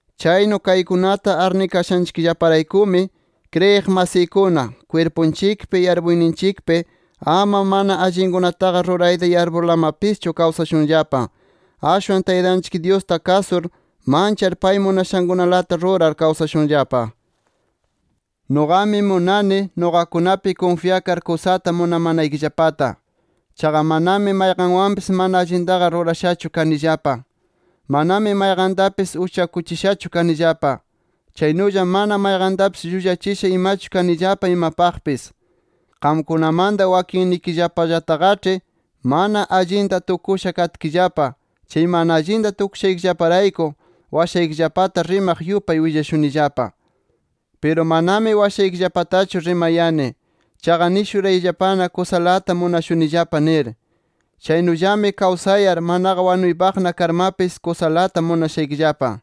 Chaynu kaykunata arnikashanchikllaparaykumi, kriyiq masiykuna, kwirpunchikpi, yarpuyninchikpi ama mana allinkunataqa rurayta yarpurlamapischu kawsashunllapa. Ashwan Taytanchik Dyusta kasur, manchar pay munashankunalata rurar kawsashunllapa. Nuqami munani, nuqakunapi kunfyakar kusata munamanaykillapata. Chaqa manami mayqanwanpis mana allintaqa rurashachu kanillapa. Manami mayqantapis uchakuchishachu kanillapa. Chaynulla mana mayqantapis llullachisha imachu kanillapa imapaqpis. Qamkunamanta wakinnikillapallataqaĉhi mana allinta tukusha katkillapa, chay mana allinta tukushaykillaparayku washaykillapata rimaq yupay willashunillapa. Piru manami washaykillapatachu rimayani, chaqa nishurayllapana kusalata munashunillapa nir. Chaynullami kawsayar, manaqa wanunaypaqna karmapis, kusalata munashaykillapa.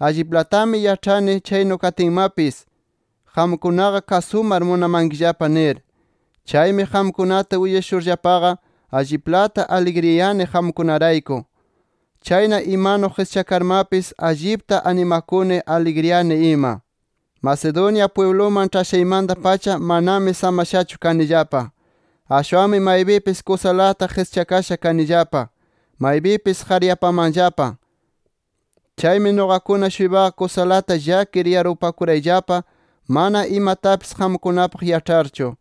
Alliplatami yaĉhani chaynu katinmapis, qamkunaqa kasumar munamankillapa nir. Chaymi qamkunata willashurllapaqa alliplata aligriyani qamkunarayku. Chayna imanu qischakarmapis, allipta animakuni, aligriyani ima. Macedonia pwibluman ĉhashaymanta-pacha, manami samashachu kanillapa. Ashwanmi maypipis kusalata qischakasha kanillapa. Maypipismi qaryapamaqllapa. Chaymi nuqakuna-shuypaqa kusalata llakir yarpupakurayllapa mana imatapis qamkunapaq yaĉharchu.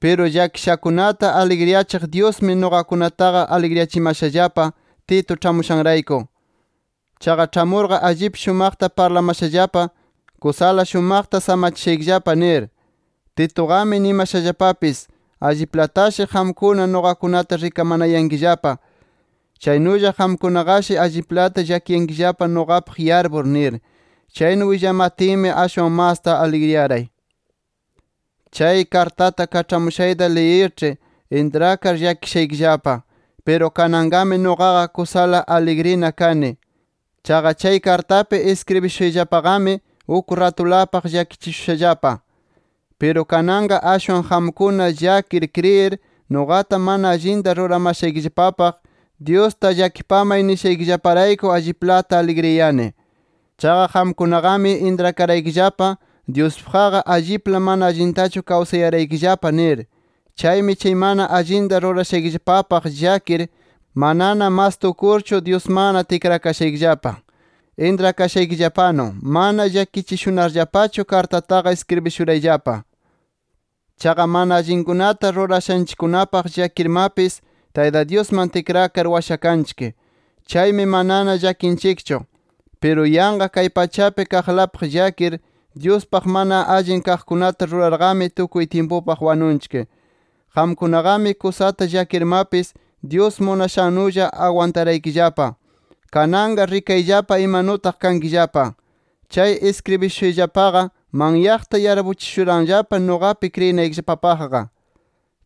Piru llakishakunata aligriyachiq Dyusmi nuqakunataqa aligriyachimashallapa, Tito ĉhamushanrayku. Chaqa ĉhamurqa allip shumaqta parlamashallapa, kusala shumaqta samachishaykillapa nir. Tituqami nimashallapapis, alliplatashi qamkuna nuqakunata rikamanayankillapa, chaynulla qamkunaqashi alliplata llakiyankillapa nuqapaq yarpur nir. Chaynu willamatinmi ashwan masta aligriyaray. Chay kartata kaĉhamushayta liyirĉhi intrakar llakishaykillapa. Piru kananqami nuqaqa kusala aligrina kani. Chaqa chay kartapi iskribishushayllapaqami uk ratulapaq llakichishushallapa. Piru kananqa ashwan qamkuna llakir kriyir, nuqata mana allinta ruramashaykillapapaq, Dyusta llakipamay nishaykillaparayku, alliplata aligriyani. Chaqa qamkunaqami intrakaraykillapa Dyuspaqqa allipla mana allintachu kawsayaraykillapa nir. Chaymi chay mana allinta rurashaykillapapaq llakir, manana mas tukurchu, Dyusmanna tikrakashaykillapa. Intrakashaykillapanu mana llakichishunarllapachu kartataqa iskribishurayllapa. Chaqa mana allinkunata rurashanchikkunapaq llakirmapis, Tayta Dyusman tikrakar washakanchik. Chaymi manana llakinchikchu. Piru yanqa kay pachapi kaqlapaq llakir, Dyuspaq mana allin kaqkunata rurarqami, tukuy tyimpupaq wanunchik. Qamkunaqami kusata llakirmapis, Dyus munashannulla agwantaraykillapa. ¡Kananqa rikayllapa imanutaq kankillapa! Chay iskribishushayllapaqa manyaqta yarpuchishuranllapa nuqapi kriyinaykillapapaqqa.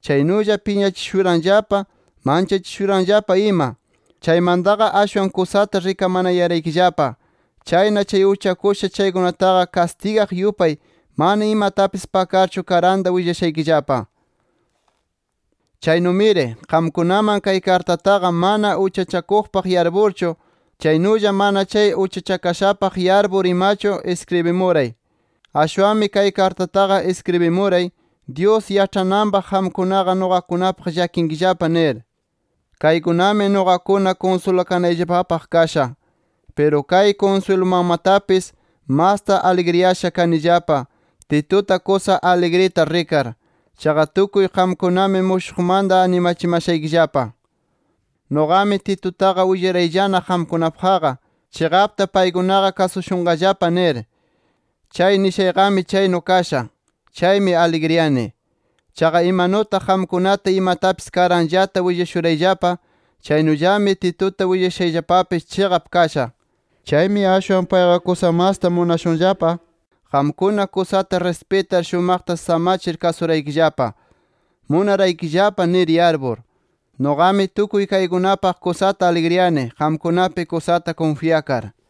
Chaynulla piñachishuranllapa, manchachishuranllapa ima. Chaymantaqa ashwan kusata rikamanayaraykillapa. Chayna chay uchakusha chaykunataqa kastigaq yupay mana imatapis pakarchu karanta willashaykillapa. Chaynumiri, qamkunaman chay kartataqa mana uchachakuqpaq yarpurchu, chaynulla mana chay uchachakashapaq yarpur imachu iskribimuray. Ashwanmi chay kartataqa iskribimuray, Dyus yaĉhananpaq qamkunaqa nuqakunapaq llakinkillapa nir. Kaykunami nuqakuna kunsulakanayllapapaq kasha. Piru kay kunswilumanmatapis, masta aligriyasha kanillapa Tituta kusa aligrita rikar. Chaqa tukuy qamkunami mushuqmanta animachishaykillapa. Nuqami Titutaqa willarayllana qamkunapaqqa, chiqapta paykunaqa kasushunqallapa nir. Chay nishayqami chaynu kasha. Chaymi aligriyani. Chaqa imanutaq qamkunata imatapis karanllata willashurayllapa, chaynullami Tituta willashayllapapis chiqap kasha. Chaymi ashwan payqa kusa masta munashunllapa, qamkuna kusata rispitar shumaqta samachir kasuraykillapa, munaraykillapa nir yarpur. ¡Nuqami tukuy kaykunapaq kusata aligriyani, qamkunapi kusata kunfyakar!